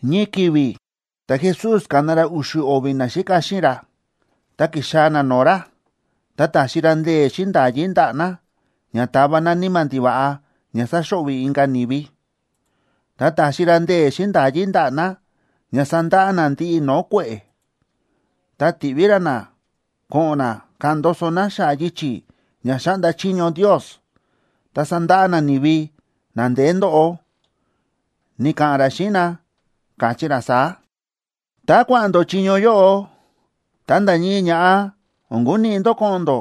Ñii ki̱vi̱ ta̱Jesús ka̱na ra u̱xu̱ o̱vi̱ naxíka xíꞌin ra, ta ki̱xaa̱ na no̱o̱ ra, ta ta̱xi ra ndee̱ xíꞌin nda̱yí ndaꞌa̱ na ña tava na níma̱ ndiva̱ꞌa ña sáxo̱ꞌvi̱ inka̱ ni̱vi, ta ta̱xi ra ndee̱ xíꞌin nda̱yí ndaꞌa̱ na ña sandaꞌa na ndiꞌi no̱o̱ kue̱ꞌe̱. Ta ti̱ꞌví ra na ko̱ꞌo̱n na ka̱ꞌa̱n ndoso na xa̱ꞌa̱ yichi̱ ña xáꞌnda chiño Ndios, ta sandaꞌa na ni̱vi na ndeé ndóꞌo. Ni̱ka̱ꞌa̱n ra xíꞌin na, káchí ra saá: ―Tá kua̱ꞌa̱n ndó chiño yóꞌo, ta nda̱ ñii ña̱ꞌa o̱n kuniꞌi ndó ko̱ꞌo̱n ndó: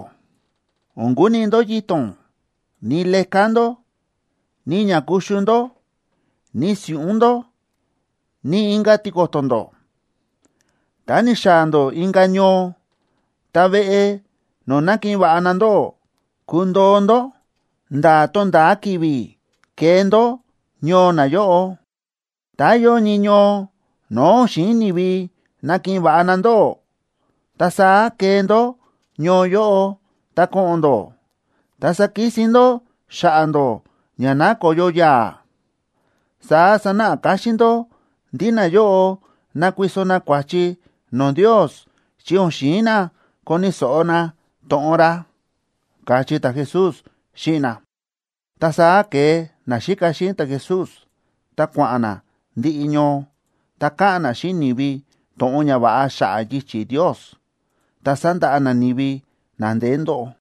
o̱n kuniꞌi ndó yito̱n,a ni leká ndó, ni ña kuxu ndó, ni si̱ꞌún ndó, ni inka̱ tiko̱to̱ ndó. Tá ni̱xaa̱ ndó inka̱ ñoo, ta veꞌe no̱o̱ nakiꞌin va̱ꞌa na ndóꞌó, kundoo ndó nda̱ tonda̱a ki̱vi̱ kee ndó ñoo nayóꞌo. Tá yóo ñii ñoo no̱o̱ o̱n xi̱in ni̱vi nakiꞌin va̱ꞌa na ndóꞌó, ta saá kee ndó ñoo yóꞌo ta ko̱ꞌo̱n ndó, ta sakisin ndó xa̱ꞌa̱ ndó ña nakoyo yaa̱. Saá sanáꞌa káxín ndó ndí nayóꞌo nákuiso na kua̱chi no̱o̱ Ndios, chi o̱n xi̱in na koni̱ so̱ꞌo na to̱ꞌon ra ―káchí ta̱Jesús xíꞌin na. Ta saá ke̱e naxíka xíꞌin ta̱Jesús, ta kua̱ꞌa̱n na ndiꞌi ñoo, ta káꞌa̱n na xíꞌin ni̱vi to̱ꞌon ñava̱ꞌa xa̱ꞌa̱ yichi̱ Ndios, ta sa̱ndaꞌa na ni̱vi na ndeé ndóꞌo.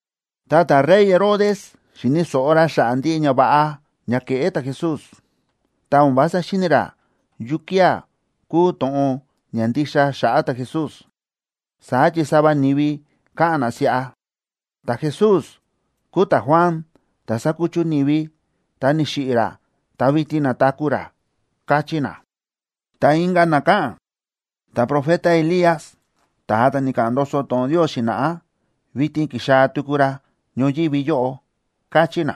Ta ta̱rey Herodes, xi̱ni̱ so̱ꞌo ra xa̱ꞌa̱ ndiꞌi ñava̱ꞌa ña ke̱ꞌé ta̱Jesús, ta o̱n vása xíni̱ ra yukía̱ kúu to̱ꞌon ña ndixa xa̱ꞌa̱ ta̱Jesús. Saá chi sava ni̱vi káꞌa̱n na siꞌa: ―Ta̱Jesús kúu ta̱Juan, ta̱ sa̱kuchu ni̱vi, ta ni̱xiꞌi̱ ra ta vitin na̱taku̱ ra ―káchí na. Ta inka̱ na káꞌa̱n: ―Ta̱profeta Elías, ta̱a ta̱ ni̱ka̱ꞌa̱n ndoso to̱ꞌon Ndios xi̱na̱ꞌá, vitin ki̱xaa̱ tuku ra ñoyívi yóꞌo ―káchí na.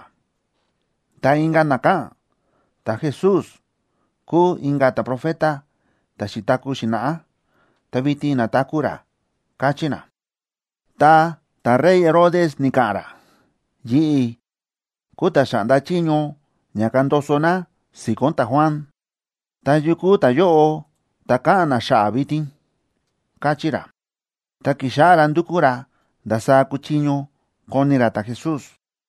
Ta inka̱ na káꞌa̱n: ―Ta̱Jesús kúu inka̱ ta̱profeta ta̱ xi̱taku̱ xi̱na̱ꞌá, ta vitin na̱taku̱ ra ―káchí na. Ta ta̱rey Herodes ni̱ka̱ꞌa̱n ra: ―Yi̱ꞌi̱ kúu ta̱ xa̱ꞌnda chiño ña kandoso na si̱ko̱n ta̱Juan. ¿Ta yu kúu ta̱yóꞌo ta̱ káꞌa̱n na xa̱ꞌa̱ vitin? ―káchí ra. Ta ki̱xáꞌá ra ndúkú ra ndasaá kuchiño koni ra ta̱Jesús.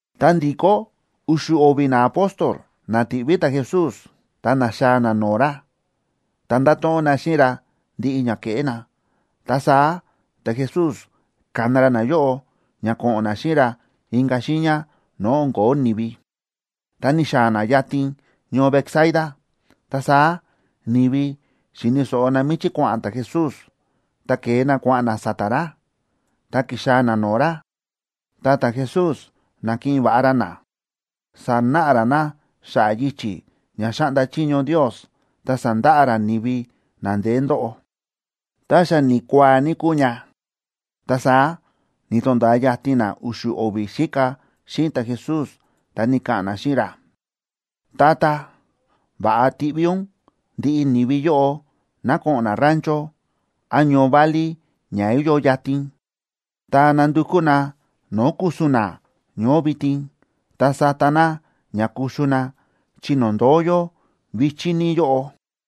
Ta ndi̱kó u̱xu̱ o̱vi̱ naapóstol na ti̱ꞌví ta̱Jesús, ta na̱xaa̱ na no̱o̱ ra, ta nda̱to̱ꞌon na xíꞌin ra ndiꞌi ña ke̱ꞌé na. Ta saá ta̱Jesús ka̱na ra nayóꞌo ña ko̱ꞌo̱n na xíꞌin ra inka̱ xiiña no̱o̱ o̱n ko̱ó ni̱vi, ta ni̱xaa̱ na yatin ñoo Betsaida. Ta saá ni̱vi xi̱ni̱ so̱ꞌo na míchí kua̱ꞌa̱n ta̱Jesús, ta ke̱e na kua̱ꞌa̱n na sa̱ta̱ ra. Ta ki̱xaa̱ na no̱o̱ ra, ta ta̱Jesús na̱kiꞌin va̱ꞌa ra na. Sánáꞌa ra na xa̱ꞌa̱ yichi̱ ña xáꞌnda chiño Ndios, ta sa̱ndaꞌa ra ni̱vi na ndeé ndóꞌo. Ta xa ni̱kuaa ní kúu ña, ta saá ni̱to̱nda̱a yatin na u̱xu̱ o̱vi̱ xíka xíꞌin ta̱Jesús, ta ni̱ka̱ꞌa̱n na xíꞌin ra: ―Tata, va̱ꞌa tiꞌví ún ndiꞌi ni̱vi yóꞌo ná ko̱ꞌo̱n na rancho án ñoo válí ña yóo yatin, ta nandukú na no̱o̱ ku̱su̱n na ñoó vitin, ta sata na ña kuxu na, chi no̱o̱ ndóo yó vi̱chí ní yóꞌo.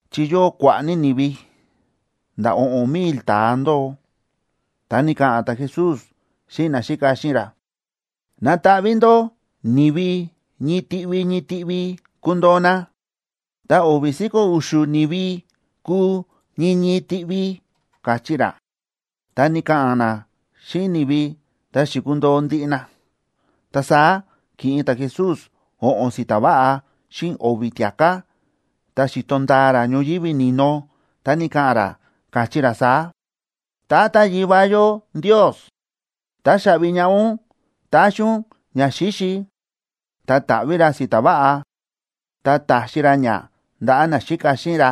Chi yóo kua̱ꞌa̱ ní ni̱vi, nda̱ o̱ꞌo̱n mil ta̱a ndóo. Ta ni̱ka̱ꞌa̱n ta̱Jesús xíꞌin naxíka xíꞌin ra: ―Nataꞌví ndó ni̱vi ñii tiꞌvi ñii tiꞌvi kundoo na, ta o̱vi̱ si̱ko̱ u̱xu̱ ni̱vi kúu ñii ñii tiꞌvi ―káchí ra. Ta ni̱ka̱ꞌa̱n na xíꞌin ni̱vi, ta xi̱kundoo ndiꞌi na. Ta saá ki̱ꞌin ta̱Jesús o̱ꞌo̱n si̱ta̱ váꞌa xíꞌin o̱vi̱ tia̱ká, ta xi̱to ndaa ra ñoyívi ni̱no, ta ni̱ka̱ꞌa̱n ra, káchí ra saá: ―Tata Yivá yó Ndios, táxaꞌvi ñaꞌá ún ta̱xi ún ñaxíxi. Ta ta̱ꞌví ra si̱ta̱ váꞌa, ta ta̱xi ra ña ndaꞌa̱ naxíka xíꞌin ra,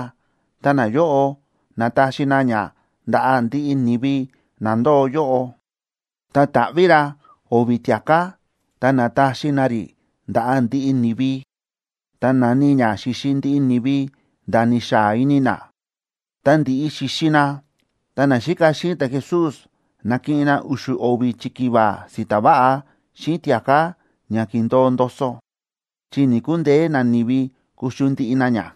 ta nayóꞌo na̱taxi na ña ndaꞌa̱ ndiꞌi ni̱vi na ndóo yóꞌo. Ta ta̱ꞌví ra o̱vi̱ tia̱ká ta na̱taxi na rí ndaꞌa̱ ndiꞌi ni̱vi. Ta na̱ni ña xi̱xi ndiꞌi ni̱vi nda̱ ni̱xaa ini na. Tá ndi̱ꞌi xi̱xi na, ta naxíka xíꞌin ta̱Jesús na̱kiꞌin na u̱xu̱ o̱vi̱ chikiva si̱ta̱ váꞌa xíꞌin tia̱ká ña ki̱ndo̱o ndoso, chi ni̱‑kundeé nani̱vi kuxu ndiꞌi na ña.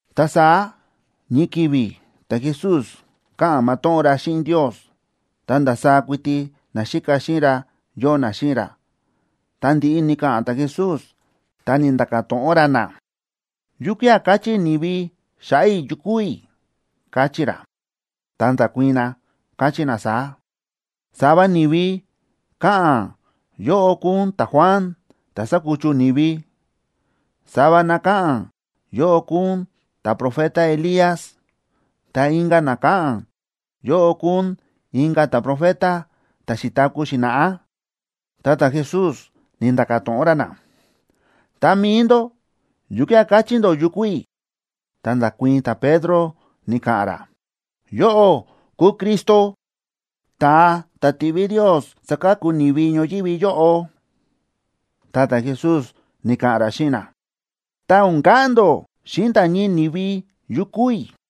Ta saá ñii ki̱vi̱ ta̱Jesús káꞌa̱n matóꞌón ra xíꞌin Ndios, ta ndasaá kuiti naxíka xíꞌin ra yóo na xíꞌin ra. Tá ndi̱ꞌi ni̱ka̱ꞌa̱n ta̱Jesús, ta ni̱nda̱ka̱ to̱ꞌon ra na: ―¿Yukía̱ káchí ni̱vi xa̱ꞌa̱ i̱ yu kúu i̱? ―káchí ra. Ta nda̱kuii̱n na, káchí na saá: ―Sava ni̱vi káꞌa̱n yóꞌó kúu ún ta̱Juan, ta̱ sa̱kuchu ni̱vi. Sava na káꞌa̱n yóꞌó kúu ún ta̱profeta Elías, ta inka̱ na káꞌa̱n yóꞌó kúu ún inka̱ ta̱profeta ta̱ xi̱taku̱ xi̱na̱ꞌá. Ta ta̱Jesús ni̱nda̱ka̱ to̱ꞌon ra na: ―Ta mi̱i ndó, ¿yukía̱ káchí ndó yu kúu i̱? Ta nda̱kuii̱n ta̱Pedro, ni̱ka̱ꞌa̱n ra: ―Yóꞌó kúu Cristo, ta̱a ta̱ ti̱ꞌví Ndios saka̱ku ni̱vi ñoyívi yóꞌo. Ta ta̱Jesús ni̱ka̱ꞌa̱n ra xíꞌin na: ―Ta o̱n ka̱ꞌa̱n ndó xíꞌin nda̱ ñii ni̱vi yu kúu i̱.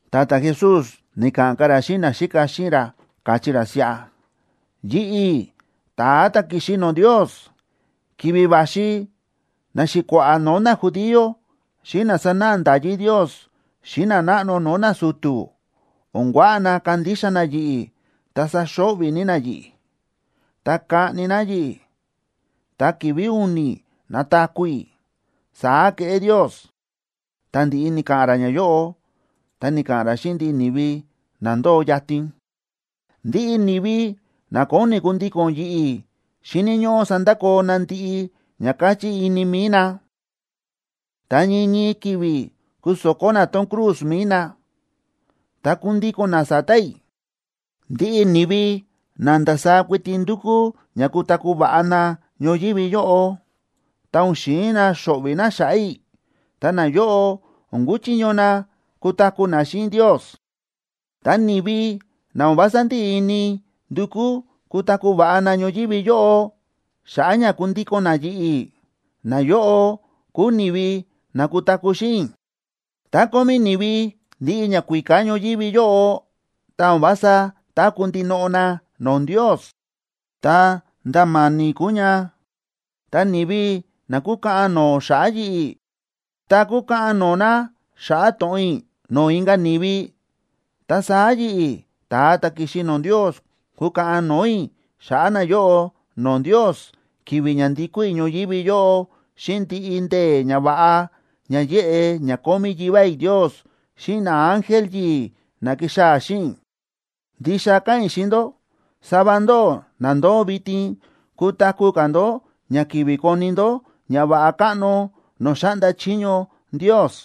Ta ta̱Jesús ni̱ka̱ꞌa̱n ka̱ ra xíꞌin naxíka xíꞌin ra, káchí ra siꞌa: ―Yi̱ꞌi̱, ta̱a ta̱ ki̱xi no̱o̱ Ndios, ki̱vi̱ va̱xi naxi̱kua̱ꞌa̱ no̱o̱ najudío, xíꞌin na sánáꞌa nda̱yí Ndios xíꞌin nanáꞌno no̱o̱ nasu̱tu̱ o̱n kuaꞌa na kandixa na yi̱ꞌi̱ ta saxo̱ꞌvi̱ ní na yi̱ꞌi̱. Ta kaꞌni na yi̱ꞌi̱, ta ki̱vi̱ u̱ni̱ nataku̱ i̱, saá keꞌé Ndios. Tá ndi̱ꞌi ni̱ka̱ꞌa̱n ra ñayóꞌo, ta ni̱ka̱ꞌa̱n ra xíꞌin ndiꞌi ni̱vi na ndóo yatin: ―Ndiꞌi ni̱vi na kóni kundíko̱n yi̱ꞌi̱ xíni̱ ñóꞌó sandakoo na ndiꞌi ña káchí ini mi̱i na, ta ñii ñii ki̱vi̱ kuso̱kó na tón cruz mi̱i nab ta kundíko̱n na sa̱ta̱ i̱. Ndiꞌi ni̱vi na ndasaá kuiti ndúkú ña kutaku̱ va̱ꞌa na ñoyívi yóꞌo, ta o̱n xi̱in na xo̱ꞌvi̱ na xa̱ꞌa̱ i̱, ta nayóꞌo o̱n kuchiño na kutaku̱ na xíꞌin Ndios. Ta ni̱vi na o̱n vása ndíꞌi ini ndukú kutaku̱ va̱ꞌa na ñoyívi yóꞌo, xa̱ꞌa̱ ña kundíko̱n na yi̱ꞌi̱, nayóꞌo kúu ni̱vi na kutaku̱ xíꞌin i̱. Tá kómí ni̱vi ndiꞌi ñakuíká ñoyívi yóꞌo, ta o̱n vása táku̱ ndinoꞌo na no̱o̱ Ndios, ta nda̱ ma̱ni̱ kúu ña. Ta ni̱vi na kúkaꞌan no̱o̱ xa̱ꞌa̱ yi̱ꞌi̱, ta kúkaꞌan no̱o̱ na xa̱ꞌa̱ to̱ꞌon i̱ no̱o̱ inka̱ ni̱vi, ta saá yi̱ꞌi̱, ta̱a ta̱ ki̱xi no̱o̱ Ndios, kukaꞌan no̱o̱ i̱ xa̱ꞌa̱ nayóꞌo no̱o̱ Ndios ki̱vi̱ ña ndikó i̱ ñoyívi yóꞌo xíꞌin ndiꞌi ndee̱ ñava̱ꞌa ña yéꞌe ña kómí Yivá i̱ Ndios xíꞌin naángel yi̱i̱, na kixaa̱ xíꞌin i̱. Ndixa káꞌa̱n i̱ xíꞌin ndó, sava ndóꞌó na ndóo vitin, kutaku̱ ka̱ ndó ña kivi koni ndó ñava̱ꞌa káꞌno no̱o̱ xáꞌnda chiño Ndios.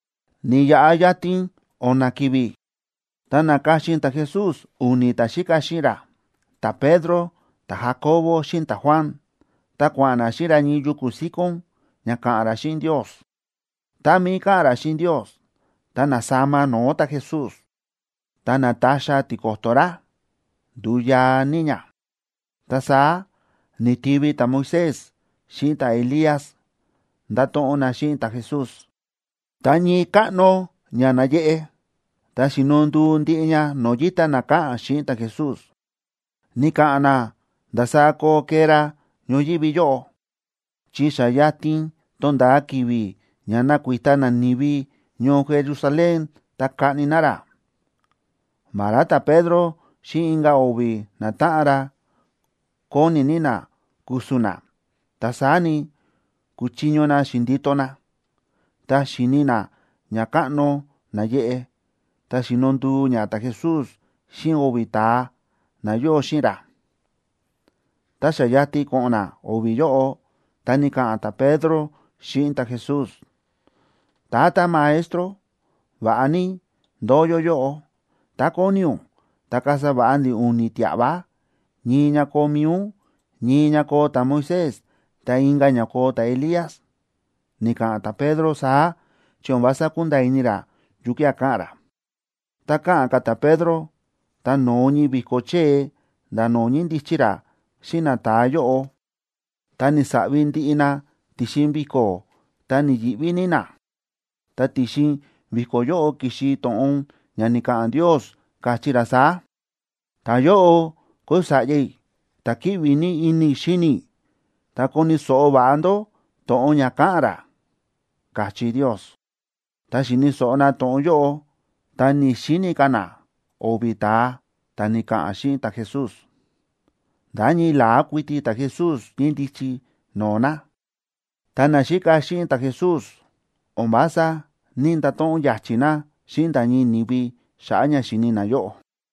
Ni̱yaꞌa yatin o̱na̱ ki̱vi̱, ta na̱ka̱xin ta̱Jesús u̱ni̱ ta̱xíka xíꞌin ra, ta̱Pedro, ta̱Jacobo xíꞌin ta̱Juan, ta kua̱ꞌa̱n na xíꞌin ra ñii yuku̱ síkón, ña ka̱ꞌa̱n ra xíꞌin Ndios. Tá mií káꞌa̱n ra xíꞌin Ndios, ta na̱sama no̱o̱ ta̱Jesús, ta nátaxa tiko̱to̱ ra, ndu̱u yaa ní ña. Ta saá ni̱tivi ta̱Moisés xíꞌin ta̱Elías, ndáto̱ꞌon na xíꞌin ta̱Jesús. Ta ñii káꞌno ña náyeꞌe, ta xíno nduu ndiꞌi ña no̱o̱ yíta na káꞌa̱n xíꞌin ta̱Jesús. Ni̱ka̱ꞌa̱n na ndasaá koo kee ra ñoyívi yóꞌo, chi xa yatin tonda̱a ki̱vi̱ ña nakuita nani̱vi ñoo Jerusalén ta kaꞌni na ra. Vará ta̱Pedro xíꞌin inka̱ o̱vi̱ natáꞌan ra kóni ní na ku̱su̱n na, ta saá ni, ku̱chiño na xi̱ndito na, ta xi̱ni na ñakáꞌno náyeꞌe, ta xíno nduu ña ta̱Jesús xíꞌin o̱vi̱ ta̱a na yóo xíꞌin ra. Tá xa yatin ko̱ꞌo̱n na o̱vi̱ yóꞌo, ta ni̱ka̱ꞌa̱n ta̱Pedro xíꞌin ta̱Jesús: ―Tata Maestro, va̱ꞌa ní ndóo yó yóꞌo. Tá kóni ún, ta kasa va̱ꞌa ndi̱ u̱ni̱ tia̱ꞌva, ñii ña koo mi̱i ún, ñii ña koo ta̱Moisés, ta inka̱ ña koo ta̱Elías. Ni̱ka̱ꞌa̱n ta̱Pedro saá chi o̱n vása ku̱nda̱a̱ ini ra yukía̱ káꞌa̱n ra. Tá káꞌa̱n ka̱ ta̱Pedro, ta no̱o ñii vi̱ko̱ chée nda̱ no̱o̱ ñíndichi ra xíꞌin nata̱a yóꞌo, ta ni̱saꞌvi ndiꞌi na ti̱xin vi̱ko̱, ta ni̱yi̱ꞌví ní na. Ta ti̱xin vi̱ko̱ yóꞌo ki̱xi to̱ꞌon ña ni̱ka̱ꞌa̱n Ndios, káchí ra saá: ―Ta̱yóꞌo kúu Sa̱ꞌya i̱, ta̱ kíꞌvi ní ini i̱ xíni i̱. Ta koni̱ so̱ꞌo va̱ꞌa ndó to̱ꞌon ña ka̱ꞌa̱n ra ―káchí Ndios. Tá xíni̱ so̱ꞌo na to̱ꞌon yóꞌo, ta ni̱‑xini ka̱ na o̱vi̱ ta̱a ta̱ ni̱ka̱ꞌa̱n xíꞌin ta̱Jesús, nda̱ ñii la̱á kuiti ta̱Jesús ñíndichi no̱o̱ na. Ta naxíka xíꞌin ta̱Jesús o̱n vása ní‑ndato̱ꞌon ya̱chi̱ na xíꞌin nda̱ ñii ni̱vi xa̱ꞌa̱ ña xi̱ni nayóꞌo.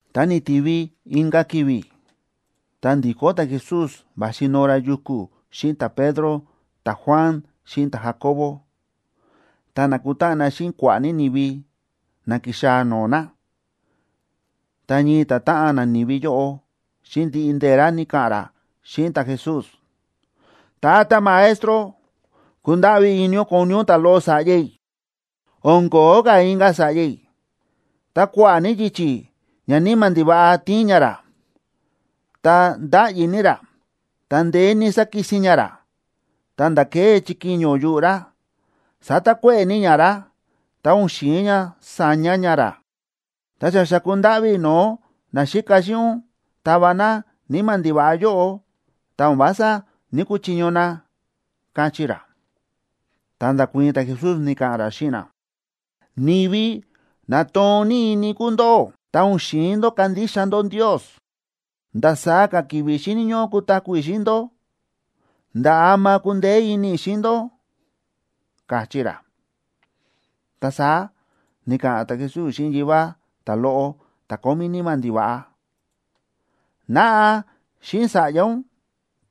Ta ni̱tivi inka̱ ki̱vi̱, ta ndi̱kó ta̱Jesús va̱xi noo ra yuku̱ xíꞌin ta̱Pedro, ta̱Juan, xíꞌin ta̱Jacobo, ta na̱kutáꞌan na xíꞌin kua̱ꞌa̱ ní ni̱vi na ki̱xaa̱ no̱o̱ na. Ta ñii ta̱táꞌan nani̱vi yóꞌo, xíꞌin ndiꞌi ndee̱ ra ni̱ka̱ꞌa̱n ra xíꞌin ta̱Jesús: ―Tata Maestro, kundáꞌví ini ún koni ún ta̱loꞌo sa̱ꞌya i̱. O̱n ko̱ó ka̱ inka̱ sa̱ꞌya i̱, ta kua̱ꞌa̱ ní yichi̱ ñaníma̱ ndiva̱ꞌa tíin ña ra, ta ndáꞌyi ní ra, ta ndeé ní sákisin ña ra, ta̱nda̱ kée chikiño yuꞌu̱ ra. Sátakuéꞌe̱ ní ña ra, ta o̱n xi̱in ña saña ña ra. Ta xa xa̱ku ndáꞌví i̱ no̱o̱ naxíka xíꞌin ún tava na níma̱ ndiva̱ꞌa yóꞌo, ta o̱n vása ní‑kuchiño na ―káchí ra. Ta nda̱kuii̱n ta̱Jesús, ni̱ka̱ꞌa̱n ra xíꞌin na: ―¡Ni̱vi na toon ní ini kúu ndóꞌó, ta o̱n xi̱in ndó kandixa ndó Ndios! ¿Ndasaá ka̱ ki̱vi̱ xíni̱ ñóꞌó kutaku̱ i̱ xíꞌin ndó? ¿Nda̱ ama kundeé ini i̱ xíꞌin ndó? ―káchí ra. Ta saá ni̱ka̱ꞌa̱n ta̱Jesús xíꞌin yivá ta̱loꞌo ta̱ kómí níma̱ ndiva̱ꞌa: ―Naꞌa xíꞌin sa̱ꞌya ún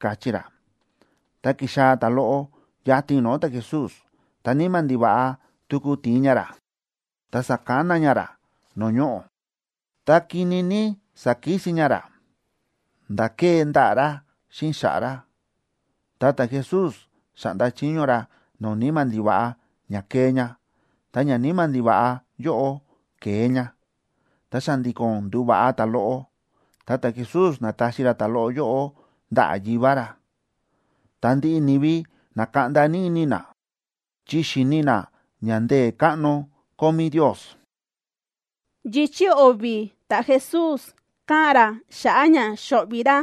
―káchí ra. Ta ki̱xaa̱ ta̱loꞌo yatin no̱o̱ ta̱Jesús, ta níma̱ ndiva̱ꞌa tuku ti̱in ña ra, ta sa̱kana ña ra no̱o̱ ñoꞌo̱, ta kini ní sa̱kisin ña ra nda̱ kée ndaꞌa̱ ra xíꞌin xa̱ꞌa̱ ra. Ta ta̱Jesús xa̱ꞌnda chiño ra no̱o̱ níma̱ ndiva̱ꞌa ña kee ña. Ta ñaníma̱ ndiva̱ꞌa yóꞌo ke̱e ña, ta xa̱ndi̱ko̱n ndu̱va̱ꞌa ta̱loꞌo, ta ta̱Jesús na̱taxi ra ta̱loꞌo yóꞌo ndaꞌa̱ yivá ra. Ta ndiꞌi ni̱vi na̱kaꞌnda ní ini na, chi xi̱ni na ña ndee̱ káꞌno kómí Ndios. Yichi̱ o̱vi̱ ta̱Jesús káꞌa̱n ra xa̱ꞌa̱ ña xo̱ꞌvi̱ ra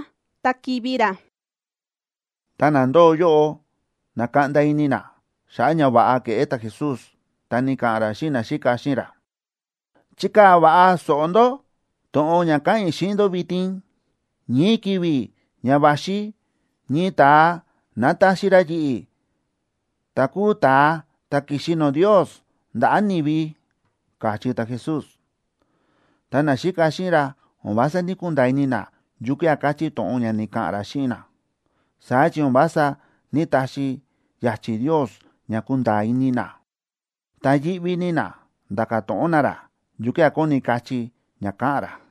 ta kivi̱ ra Ta na ndóo yóꞌo na̱kaꞌnda ini na xa̱ꞌa̱ ñava̱ꞌa ke̱ꞌé ta̱Jesús, ta ni̱ka̱ꞌa̱n ra xíꞌin naxíka xíꞌin ra: ―Chikaa̱ va̱ꞌa so̱ꞌo ndó to̱ꞌon ña káꞌa̱n i̱ xíꞌin ndó vitin. Ñii ki̱vi̱ ña va̱xi ñii ta̱a nataxi ra yi̱ꞌi̱, ta̱ kúu ta̱a ta̱ ki̱xi no̱o̱ Ndios, ndaꞌa̱ ni̱vi ―káchí ta̱Jesús. Ta naxíka xíꞌin ra o̱n vása ní‑kunda̱a̱ ini na yukía̱ káchí to̱ꞌon ña ni̱ka̱ꞌa̱n ra xíꞌin na, saá chi o̱n vása ní‑taxi ya̱chi̱ Ndios ña kunda̱a̱ ini na. Ta yíꞌví ní na nda̱ka̱ to̱ꞌon na ra yukía̱ kóni kachí ña káꞌa̱n ra.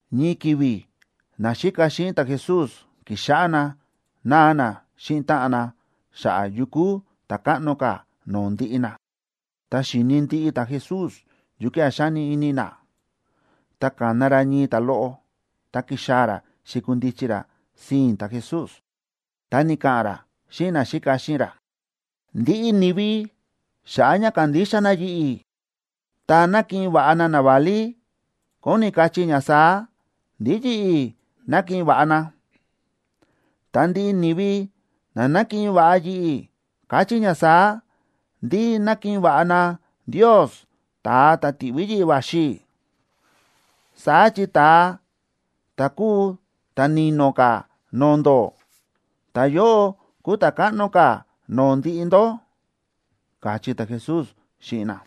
Ñii ki̱vi̱ naxíka xíꞌin ta̱Jesús ki̱xáꞌá na náa na xíꞌin táꞌan na xa̱ꞌa̱ yu kúu ta̱ káꞌno ka̱ no̱o̱ ndiꞌi na. Ta xíni̱ ndiꞌi ta̱Jesús yukía̱ xáni ini na, ta ka̱na ra ñii ta̱loꞌo, ta ki̱xaa̱ ra xi̱kundichi ra sii̱n ta̱Jesús. Ta ni̱ka̱ꞌa̱n ra xíꞌin naxíka xíꞌin ra: ―Ndiꞌi ni̱vi xa̱ꞌa̱ ña kándixa na yi̱ꞌi̱, ta nákiꞌin va̱ꞌa na naválí, kóni kachí ña saá: ndí yi̱ꞌi̱ nákiꞌin va̱ꞌa na. Ta ndiꞌi ni̱vi na nákiꞌin va̱ꞌa yi̱ꞌi̱, káchí ña saá: ndí nákiꞌin va̱ꞌa na Ndios, ta̱a ta̱ ti̱ꞌví yi̱ꞌi̱ va̱xi i̱. Saá chi ta̱a ta̱ kúu ta̱ ni̱no̱ ka̱ no̱o̱ ndó, ta̱yóꞌo kúu ta̱ káꞌno ka̱ no̱o̱ ndiꞌi ndó ―káchí ta̱Jesús xíꞌin na.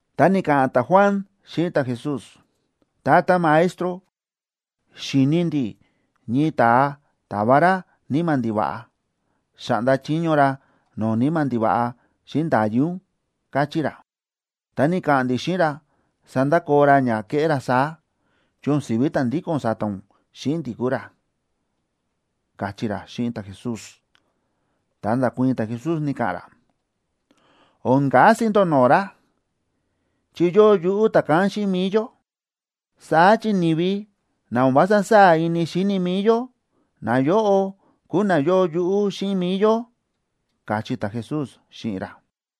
Ta ni̱ka̱ꞌa̱n ta̱Juan xíꞌin ta̱Jesús: ―Tata Maestro, xi̱ni ndi̱ ñii ta̱a táva ra níma̱ ndiva̱ꞌa. Xáꞌnda chiño ra no̱o̱ níma̱ ndiva̱ꞌa xíꞌin nda̱yí ún, káchí ra. Ta ni̱ka̱ꞌa̱n ndi̱ xíꞌin ra sandakoo ra ña kéꞌé ra saá, chi o̱n si̱ví ta̱ ndíko̱n sa̱ta̱ ún xíꞌin ndi̱ kúu ra ―káchí ra xíꞌin ta̱Jesús. Ta nda̱kuii̱n ta̱Jesús, ni̱ka̱ꞌa̱n ra: ―O̱n kasi ndó no̱o̱ ra, chi yóo yuꞌú ta̱kán xíꞌin mi̱i yó. Saá chi ni̱vi na o̱n vása sáa̱ ini xíni mi̱i yó, nayóꞌo kúu na yóo yuꞌú xíꞌin mi̱i yó ―káchí ta̱Jesús xíꞌin ra.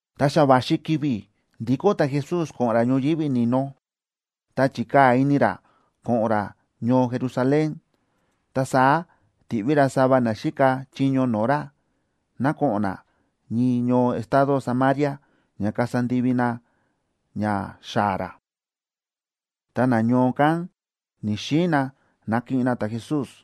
Ta xa va̱xi ki̱vi̱ ndikó ta̱Jesús ko̱ꞌo̱n ra ñoyívi ni̱no, ta chi̱kaa̱ ini ra ko̱ꞌo̱n ra ñoo Jerusalén. Ta saá ti̱ꞌví ra sava na xíka chiño no̱o̱ ra, ná ko̱ꞌo̱n na ñii ñoo estado Samaria ña kasa ndivi na ña xaa̱ ra. Ta nañoo kán ni̱‑xiin na nakiꞌin na ta̱Jesús,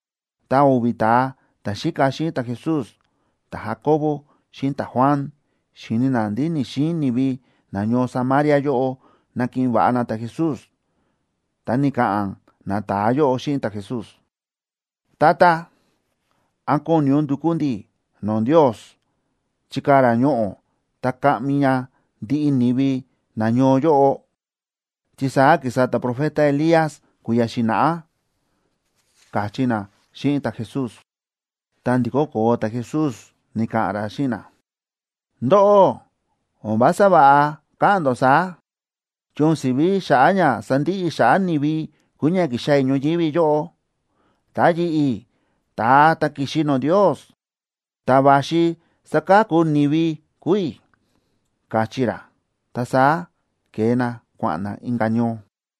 Ta o̱vi̱ ta̱a ta̱xíka xíꞌin ta̱Jesús, ta̱Jacobo xíꞌin ta̱Juan, xi̱ni na ndí ni̱‑xiin ni̱vi nañoo Samaria yóꞌo nakiꞌin va̱ꞌa na ta̱Jesús, ta ni̱ka̱ꞌa̱n nata̱a yóꞌo xíꞌin ta̱Jesús: ―Tata, ¿án kóni ún ndukú ndi̱ no̱o̱ Ndios chikaa̱ ra ñoꞌo̱ ta kaꞌmi ña ndiꞌi ni̱vi nañoo yóꞌo?, chi saá ki̱sa ta̱profeta Elías kui̱ya̱ xi̱na̱ꞌá ―káchí na xíꞌin ta̱Jesús. Ta ndi̱kó koo ta̱Jesús, ni̱ka̱ꞌa̱n ra xíꞌin na: ―Ndóꞌó, o̱n vása va̱ꞌa káꞌa̱n ndó saá, chi o̱n si̱ví xa̱ꞌa̱ ña sandiꞌi i̱ xa̱ꞌa̱ ni̱vi kúu ña ki̱xaa̱ i̱ ñoyívi yóꞌo, ta yi̱ꞌi̱, ta̱a ta̱ ki̱xi no̱o̱ Ndios, ta̱ va̱xi saka̱ku ni̱vi kúu i̱ ―káchí ra. Ta saá ke̱e na kua̱ꞌa̱n na inka̱ ñoo.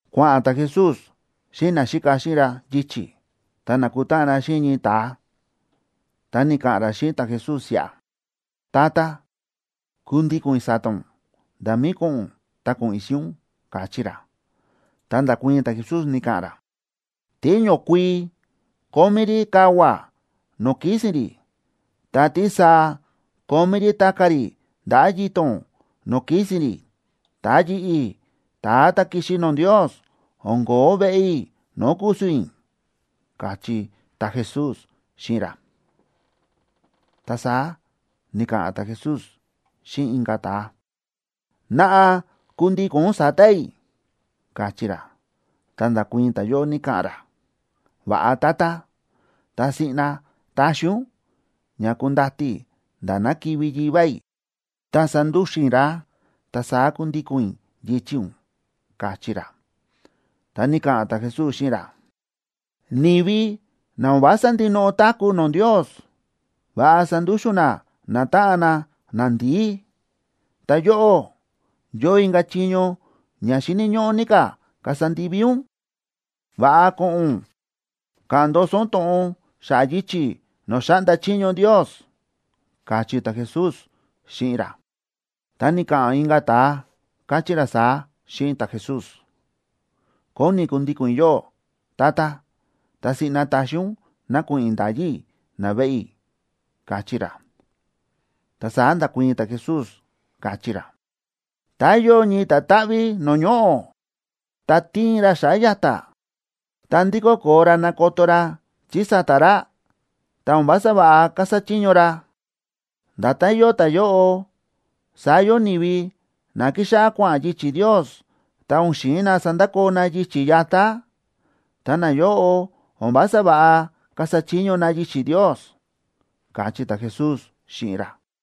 Kua̱ꞌa̱n ta̱Jesús xíꞌin naxíka xíꞌin ra yichi̱, ta na̱kutáꞌan na xíꞌin ñii ta̱a, ta ni̱ka̱ꞌa̱n ra xíꞌin ta̱Jesús siꞌa: ―Tata, kundíko̱n i̱ sa̱ta̱ ún, nda̱ mí ko̱ꞌo̱n ún ta ko̱ꞌo̱n i̱ xíꞌin ún ―káchí ra. Ta nda̱kuii̱n ta̱Jesús, ni̱ka̱ꞌa̱n ra: ―Tíñokuii kómí rí kavua̱ no̱o̱ kísi̱n rí, ta tísaa kómí rí ta̱ka̱ rí ndaꞌa̱ yito̱n no̱o̱ kísi̱n rí, ta yi̱ꞌi̱, ta̱a ta̱ ki̱xi no̱o̱ Ndios, o̱n ko̱ó veꞌe i̱ no̱o̱ ku̱su̱n i̱ ―káchí ta̱Jesús xíꞌin ra. Ta saá ni̱ka̱ꞌa̱n ta̱Jesús xíꞌin inka̱ ta̱a: ―Naꞌa kundíko̱n ún sa̱ta̱ i̱ ―káchí ra. Ta nda̱kuii̱n ta̱yóꞌo, ni̱ka̱ꞌa̱n ra: ―Va̱ꞌa Tata, ta siꞌna taxi ún ña kundati i̱ nda̱ ná kivi̱ yivá i̱, ta sandúxu̱n i̱ ra, ta saá kundíko̱n i̱ yichi̱ ún ―káchí ra. Ta ni̱ka̱ꞌa̱n ta̱Jesús xíꞌin ra: ―Ni̱vi na o̱n vása ndinoꞌo táku̱ no̱o̱ Ndios, va̱ꞌa sandúxu̱n na natáꞌan na nandi̱í. Ta yóꞌó, yóo inka̱ chiño ña xíni̱ ñóꞌó ní ka̱ kasa ndivi ún: Va̱ꞌa ko̱ꞌo̱n ún ka̱ꞌa̱n ndoso ún to̱ꞌon xa̱ꞌa̱ yichi̱ no̱o̱ xáꞌnda chiño Ndios ―káchí ta̱Jesús xíꞌin ra. Ta ni̱ka̱ꞌa̱n inka̱ ta̱a, káchí ra saá xíꞌin ta̱Jesús: ―Kóni kundíko̱n i̱ yóꞌó, Tata, ta siꞌna taxi ún ná ko̱ꞌo̱n i̱ nda̱yi i̱ naveꞌe i̱ ―káchí ra. Ta saá nda̱kuii̱n ta̱Jesús, káchí ra: ―Tá yóo ñii ta̱táꞌví no̱o̱ ñoꞌo̱, ta tiin ra xa̱ꞌa̱ ya̱ta̱, ta ndikó koo ra nakoto ra chí sa̱ta̱ ra, ta o̱n vása va̱ꞌa kasa chiño ra. Nda̱tán yóo ta̱yóꞌo, saá yóo ni̱vi na kíxáꞌá kua̱ꞌa̱n yichi̱ Ndios, ta o̱n xi̱in na sandakoo na yichi̱ yatá. Ta nayóꞌo o̱n vása va̱ꞌa kasa chiño na yichi̱ Ndios ―káchí ta̱Jesús xíꞌin ra.